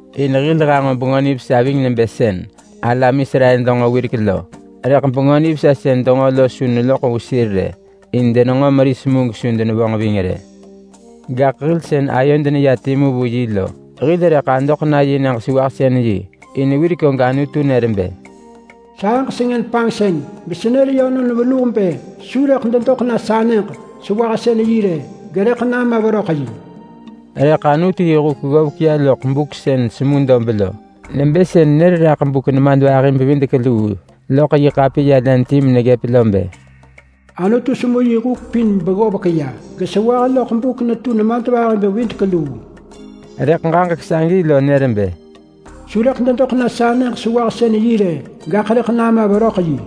In hil hanġo Bengö Nivesa ving nebë sën alam Israel denġo wirek lo. Rëḳ Bengö Nivesa sën denġo lo su neloḳ vu sir rë, in denenġo meris mu gesu denevonġ ving rë. Gaḳ hil sën hil ayod neya timu vu yi lo, hil rëḳ adoḳ na yi nyëġ-sewahsën-yi. In wirek og Anutu nër bë: “Sahëġ sengën panġsën mesenër yönon venuh bë su rëḳ dedoḳ na sa nyëġ-sewahsën-yi rë, gerëḳ nama veröḳ yi.” Rëḳ Anutu yi huk ggovek ya loḳ buk sën semu dob lo, nebë sën nër raḳ buk nemadvahi-bevidek-luu loḳ yi ḳapiya len ti meneggëp lo bë, “Anutu semu yi huk pin beggovek ya gesewah loḳ buk netu nemadvahi-bevidek-luu.” Rëḳ ġaġek sagi lo nër bë, “Su rëḳ dedoḳ na sa nyëġ-sewahsën-yi rë, gaḳ rëḳ nama veröḳ yi.”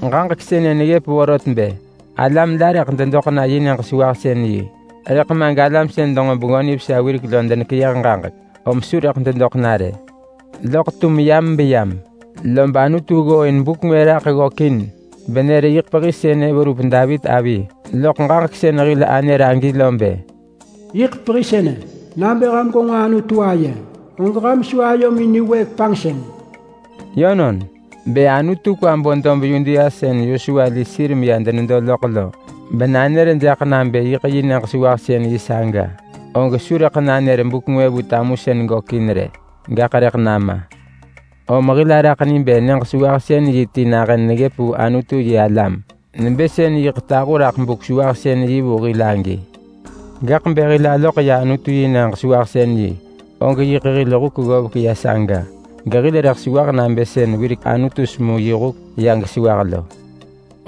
Ġaġek sënë neggëp vorot bë alam la rëḳ dedoḳ na yi nyëġ-sewahsën-yi, rëḳ ma galam sën denġo Bengö Nivesa wirek lo denekeyëh ġaġek, om su rëḳ dedoḳ na rë. Loḳ tum yam beyam lob Anutu ggooin buk ngwë raḳ ggökin benër bë ‘yiḳ pehi sënë’ verup Davit avi loḳ ġaġek sën hil anër agi lo bë: “Yiḳ pehi sënë, nabë ham gwenġo Anutu aye, og ham su ayomin niwëëk panġsën.” Yönon, bë Anutu kwa bo dob Yudea sën Yosua li sir meya denedo loḳ lo, benanër jaḳ nabë yiḳ yi nyëġ-sewahsën-yi saga, og su rëḳ nanër buk ngwë vu tamusën gökin rë, gaḳ rëḳ nama. Om hil araḳ ni bë nyëġ-sewahsën-yi ti nahën neggëp vu Anutu-yi-alam, nebë sën yiḳ tahu raḳ Buk-sewahsën-yi vu hil agi. Gaḳ bë hil aloḳ ya Anutu yi nyëġ-sewahsën-yi, og yiḳ hil huk ggovek ya saga, gehil rëḳ sewah nabë sën wirek Anutu semu yi huk ya gesewah lo.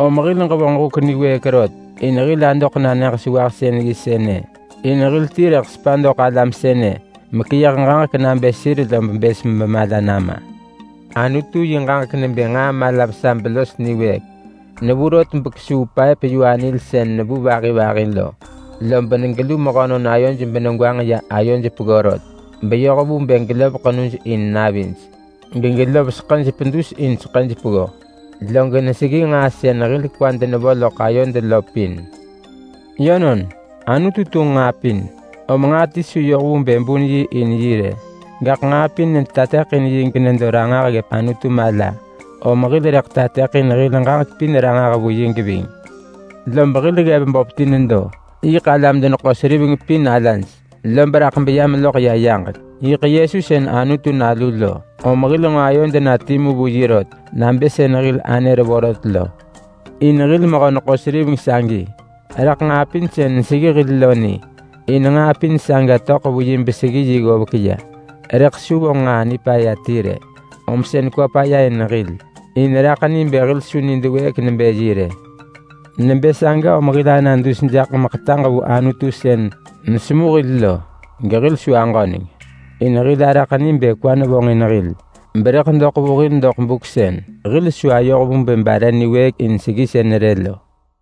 Om hil ġevonġ huk niwëëk rot in hil adoḳ na nyëġ-sewahsën-yi sënë. In hil ti rëḳ sepa doḳ alam sënë meḳeyëh ġaġek nabë sir lob bës bemala nama. Anutu yi ġaġek nebë nġaa mala vesa belos niwëëk. Nevu rot bekesuu paëp-yu-anil sën nevu vahi vahi lo. Lob negelu mehönon ayoj benegwanġ ya ayoj peggo rot beyoh vu bë gelov ḳenuj in navij gegelov seḳëj pedus in seḳëj peggo, log neseggi nġaa sën hil kwad nevo loḳ ayod lo pin. Yönon, Anutu tunġ nġaa pin, om nġaa ti su yoh vu bë bun yi in yi rë, gaḳ nġaa pin netateḳin yi genedo ranġah ggëp Anutu mala, om hil rëḳ tateḳin hil ġaġek pin ranġah vu yi geving. Lob hil ggev böp ti nedo. Yiḳ alam-deneḳo-seriveng pin alaj, lob raḳ beya meloḳ ya yaġek. Yiḳ Yesu sën Anutu Nalu lo, om hil nġo ayod na timu vu yi rot nabë sën hil anër vorot lo. In hil mehö-neḳo-seriveng sagi raḳ nġaa pin sën neseggi hil lo ni, in nġaa pin saga töḳ vu yi ggovek ya beseggi yi. Rëḳ su vonġ nġaa nipaya ti rë, om sën kwa paya in hil in raḳ ni bë hil su nid wëëk nebë yi rë. Nebë saga om hil ana dus jaḳ meḳetaġ vu Anutu sën nesemu hil lo gehil su aġöneng, in hil araḳ ni bë kwa nevonġin hil berëḳ doḳ vu hil doḳ buk sën hil su ayoh vu bë bare niwëëk in seggisën rë lo.